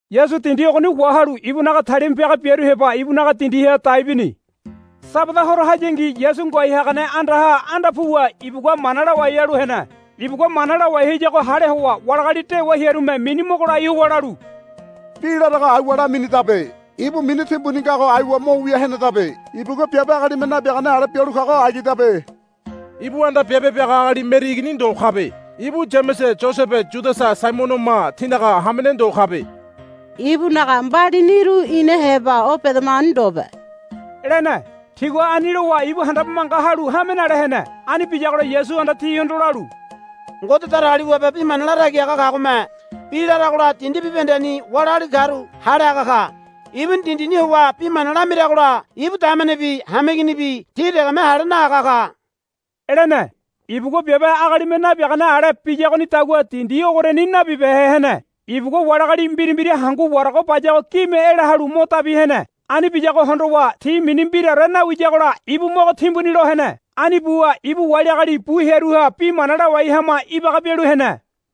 Yasu dindi ogoni wahalu ibunaga talima piaga biaru heba ibunaga dindiha dai bini. Sabada horo hayangi Yasu ngoai hagane andaha anda puwa ibugua mana lawai halu hene. Ibugua mana lawai hayago hale howa wali agali dewa hearume mini mogo lai howa lalu, Bi larago aiwa laminidabe. Ibu mini timbuni ngago aiwa mo wia henedabe. Ibugua biabe agalime nabiagane ale bialu kago agidabe. Ibu anda biabe biaga agali Meri igini ndo kabe. Ibu Yamese Yosese Yudasa Saimonoma tinaga hamene ndo kabe. Ibunaga mbalibuniru ina heba o bedamagoni ndobe, lene. Tigua ani lowa ibu handabe manga halu hame nale hene. Ani biyagola Yasuhanda tihondo lalu, Ngode Datagaliwabe bi mana latagi haga kagome bi laragola dindi bibahendeni wali agali karu hale haga ka. Ibuni dindini howa bi mana lamiragola ibu damenebi hameiginibi ti degeme hale nahaga ka, lene. Ibugua biabe agalime nabiagane ale biyagonidagua dindi ogoriani nabibehe hene. Ibugua wali agali mbira mbira hangu warago bayago gime ela halu mo dabi hene. Ani biyago hondowa ti mini mbiraore nawiyagola ibu mogo timbuni lo hene. Ani buwa ibu wali agali bu hearuha bi mana lawai hama ibaga bialu hene.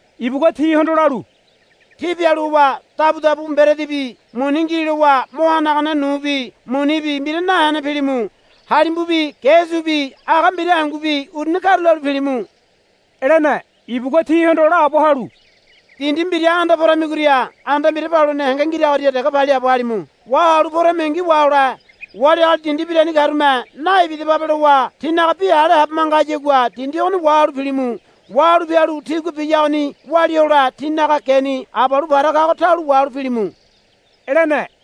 Ibugua tihondo lalu, Tí pialu howa dabudabu mberedibi muni ngi lowa mo hanagane nubi munibi mbira nahene pilimu. Halimbubi ge subi aga mbira hangubi uruni karulalu pilimu, lene. Ibugua tihondo laabo halu, Dindi mbira anda poramigoria anda mbira paluene henge ngiragoria dege paliaabo halimu. Wahalu poramingi wahole. Wali agali dindi mbirani karume, Naibidababe, lowa tínaga bi hale habe manga hayagua dindi ogoni wahalu pilimu. Wahalu pialu tigua biyagoni walia hole tínaga geni abalu para kago taulo wahalu pilimu, lene.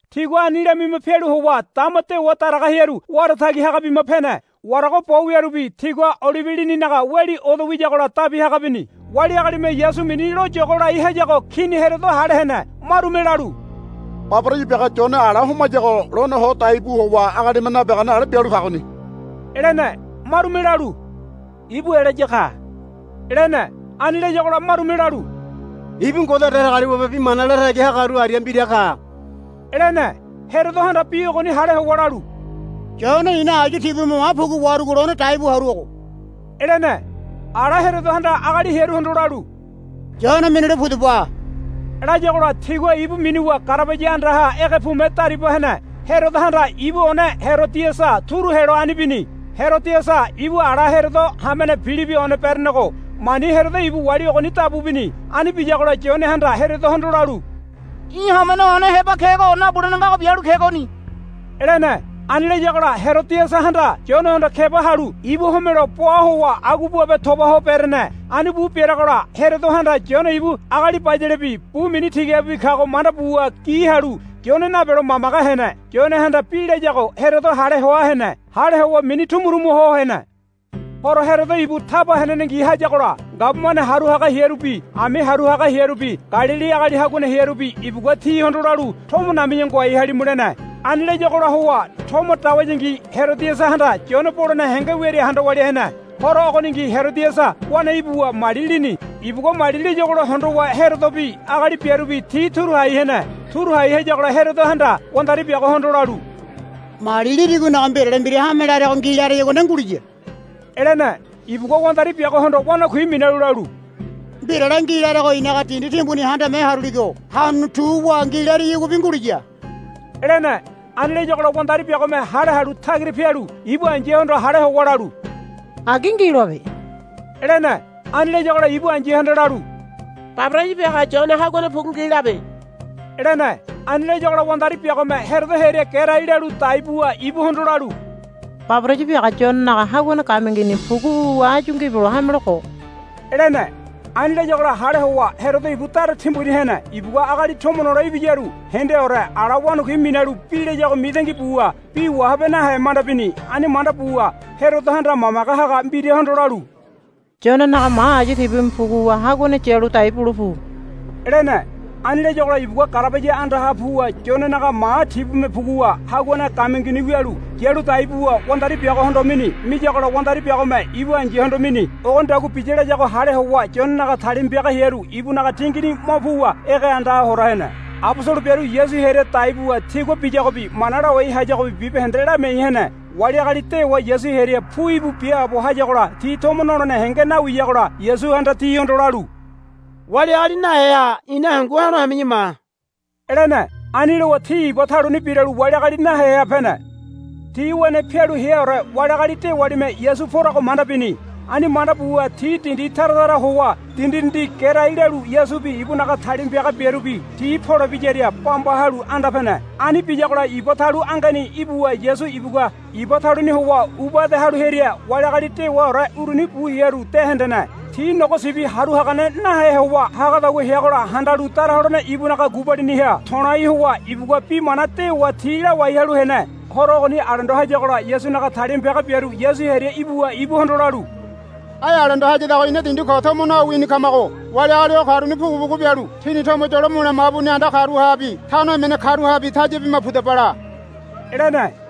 Tigua ani lamima pialu howa dama dewa daraga hearu wara tagi haga bima pene. Warago bo wiarubi tigua olibe lininaga weli odo wiyagola dabi haga bini. Wali agalime Yasu mini lo yogo lai hayago Kini Herodo hale hene. Marume lalu, Baboraya biaga Yone ala homayago lone ho dai bu howa agalime nabiagane ale bialu kagoni, lene. Marume lalu, Ibu Elaya ka, lene. Ani layagola marume lalu, Ibu Ngode Datagaliwabe bi mana latagi hagaru aria mbira ka, lene. Herodohanda bi ogoni hale howa lalu, Yone i̱na ayu tibume ma pugu waharugo lone dai bu haruago, lene. Ala Herodohanda agali hearuhondo lalu, Yone minule pudaba, layagola tigua ibu minuwa garabaya andaha ege pume dariba hene. Herodohanda ibu one Herodiasa turu helo ani bini. Herodiasa ibu ala Herodo hamene Pilibi one berenego mani Herodo ibu wali ogoni dabu bini. Ani biyagola Yonehanda Herodohondo lalu, Í̠ hamene one heba kego nabulene ngago bialu kegoni, lene. Ani layagola Herodiasahanda Yonehondo keba halu ibu homelo boa howa agua boabe toba ho berene. Ani bu bereagola Herodohanda Yone ibu agali bayalebi bu mini tigabibi kago manda buwa gi halu Yone nabelo mamage hene. Yonehanda bi layago Herodo hale hoa hene. Hale howa mini tumu tumu ho hene. Horo Herodo ibu taba henenengi hayagola gabumane haru haga hearubi ami haru haga hearubi Galili agali haguane hearubi ibugua tihondo lalu, Tomo nami̱ya ngoai halimu, lene. Ani layagola howa tomo dawayangi Herodiasahanda Yone bolene henge wiaria handa walia hene. Horo ogoningi Herodiasa wane ibuwa mali lini. Ibugua mali liyagola hondowa Herodobi agali biarubi ti turu hai hene. Turu hai hayagola Herodohanda wandari biagohondo lalu, Mali lirigonaga mbirale mbira hame larego ngi lareyagua nde nguliya, lene. Ibugua wandari biagohondo wanakui minalu lalu, Mbirale ngi larego i̱naga dindi timbuni handame haruligo hanuni tu wa ngi lariyaguabi nguliya, lene. Ani layagola wandari biagome hale halu tagira pialu ibu ai̱yahondo hale howa lalu, Agi ngi loabe, lene. Ani layagola ibu ai̱yahanda lalu, Baboraya biaga Yone haguane pugu ngi labe, lene. Ani layagola wandari biagome Herodo hearia gerai lalu dai buwa ibuhondo lalu, Baboraya biaga Yonenaga haguane gamiangini pugu wuwa áyu ngibelo hame lo ko, lene. Ani layagola hale howa Herodo ibu dara timbuni hene. Ibugua agali tomo nole ibiyaru hendeaore ala wanakui minalu bi layago mitangi buwa bi wahabe nahe manda bini. Ani manda buwa Herodohanda mamage haga mbirahondo lalu, Yonenaga ma ayu tibume puguwa haguane yalu dai bule pu, lene. Ani layagola ibugua garabaya andaha puwa Yonenaga ma tibume puguwa haguane gamiangini wialu yalu dai buwa wandari biagohondo mini. Miyagola wandari biagome ibu ai̱yahondo mini. Ogonidagua biya layago hale howa Yonenaga talima piaga hearu ibunaga tingini mo puwa ege andaha hora hene. Abosolo biaru Yasu hearia dai buwa tigua biyagobi mana lawai hayagobi bibahende lamiai hene. Wali agali dewa Yasu hearia pu íbu biaabo hayagola ti tomo nolene henge nawiyagola Yasuhanda tihondo lalu, Wali agali naheha ina hangu ha̱lo hami̱ya ma, lene. Ani lowa ti iba taluni biralu wali agali naheha pene. Ti wene pialu heaore wali agali dewalime Yasu porago manda bini. Ani manda buwa ti dindi tara tara howa dindi dindi gerai lalu Yasubi ibunaga talima piaga biarubi ti polebiyaria bamba halu anda pene. Ani biyagola iba talu angeni ibuwa Yasu ibugua iba taluni howa uba ede halu hearia wali agali dewaore uruni bu hearu de hendene. Ti nogo sibi haru hagane nahe howa hagadagua heagola handalu dara holene ibunaga gubaliniha to̱lai howa ibugua bi mana dewa ti lawai halu hene. Horo ogoni alendo hayagola Yasunaga talima piaga biaru Yasu hearia ibuwa ibuhondo lalu, Ai alendo hayadago ina dindi koni tomo nawini kamago wali agali o karuni pugu pugu bialu tini tomo yolo mule mabuni anda karuhabi tano emene karuhabi taya bima pudaba la, lene.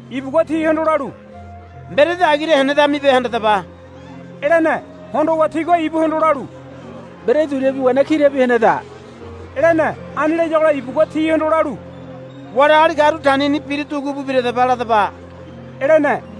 Ibugua tihondo lalu, Mberedi agira henedamibe handadaba, lene. Hondowa tigua ibuhondo lalu, Mberedi duriabi wena kirabi heneda, lene. Ani layagola ibugua tihondo lalu, Wali agali karu tanini bira dugu bu biradaba ladaba, lene.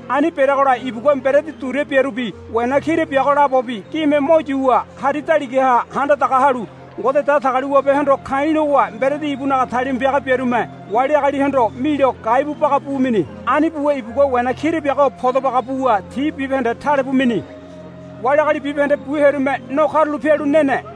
Ani bereagola ibugua mberedi duria biarubi wena kira biago labobi gime mo yuwa hari daligaha handa daga halu Ngode Datagaliwabehondo ka̱i̱ lowa mberedi ibunaga talima piaga biarume wali agalihondo milo gai bu baga bu mini. Ani buwa ibugua wena kira biago podo baga buwa ti bibahende tale bu mini. Wali agali bibahende bu hearume no karula pialu nene.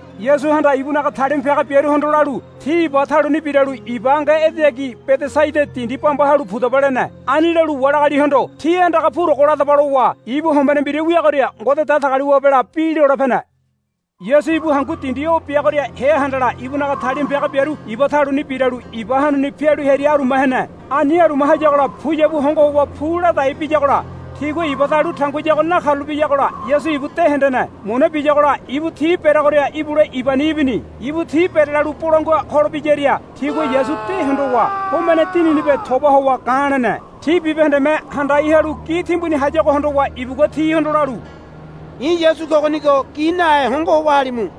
Yasuhanda ibunaga talima piaga biaruhondo lalu, Tí iba taluni biralu iba ange edeyagi Bedesaida dindi bamba halu pudaba, lene. Ani lalu wali agalihondo, Tí andaga purogo ladaba, lowa ibu hombene mbira wiagoria Ngode Datagaliwabela bi lole pene. Yasu ibu hangu dindi o biagoria hea handala ibunaga talima piaga biaru iba taluni biralu iba hanuni pialu hearia aruma hene. Ani aruma hayagola puyabu hongo howa pu ladai biyagola tigua iba talu tanguiyago nakarulapeyagola Yasu ibu de hendene. Muna biyagola ibu ti bereagoria ibule ibani ibini. Ibu ti berelalu bolangua holebiyaria tigua Yasu de hondowa homene dininibe toba howa ga̱ lene. Ti bibahendeme handai halu gi timbuni hayago hondowa ibugua tihondo lalu, I̱ Yasu kogonigo gi nahe hongo howa halimu,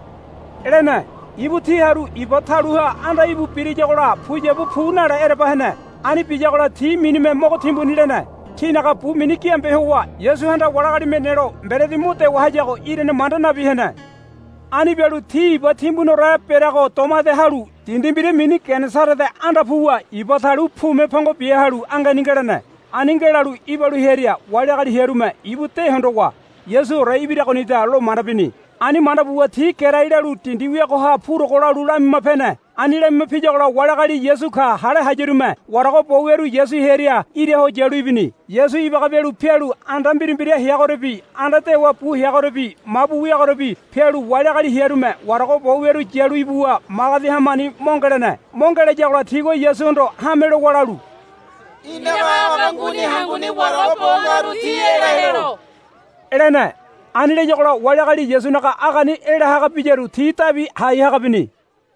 lene. Ibu ti haru iba taluha anda íbu birayagola puyabu pu nale ereba hene. Ani biyagola ti minime mogo timbuni lene. Tinaga bu mini giambe howa Yasuhanda wali agalime nelo mberedi mo dewa hayago irane manda nabi hene. Ani bialu ti iba timbuniore bereago doma ede halu dindi mbira mini Genesarete anda puwa iba talu pume pongo bia halu angeni ngelene. Ani ngelalu ibalu hearia wali agali hearume ibu de hondowa, Yasuore ibiragonida, lo manda bini. Ani manda buwa ti gerai lalu dindi wiagoha purogo lalu lamima pene. Ani lamima piyagola wali agali, Yasu ka, hale hayarume warago bo wiaru Yasu hearia ira ho yalu ibini. Yasu ibaga bialu pialu anda mbira mbira heagoriabi anda dewa bu heagoriabi mabu wiagoriabi pialu wali agali hearume warago bo wiaru yalu ibuwa magedi hamani mo ngelene. Mo ngelayagola tigua Yasuhondo hame lowa lalu, Í̠naga aga nguni hanguni warago bo ngaru ti ela helo, lene. Ani layagola wali agali Yasunaga agani ela haga biyaru ti dabi hai haga bini.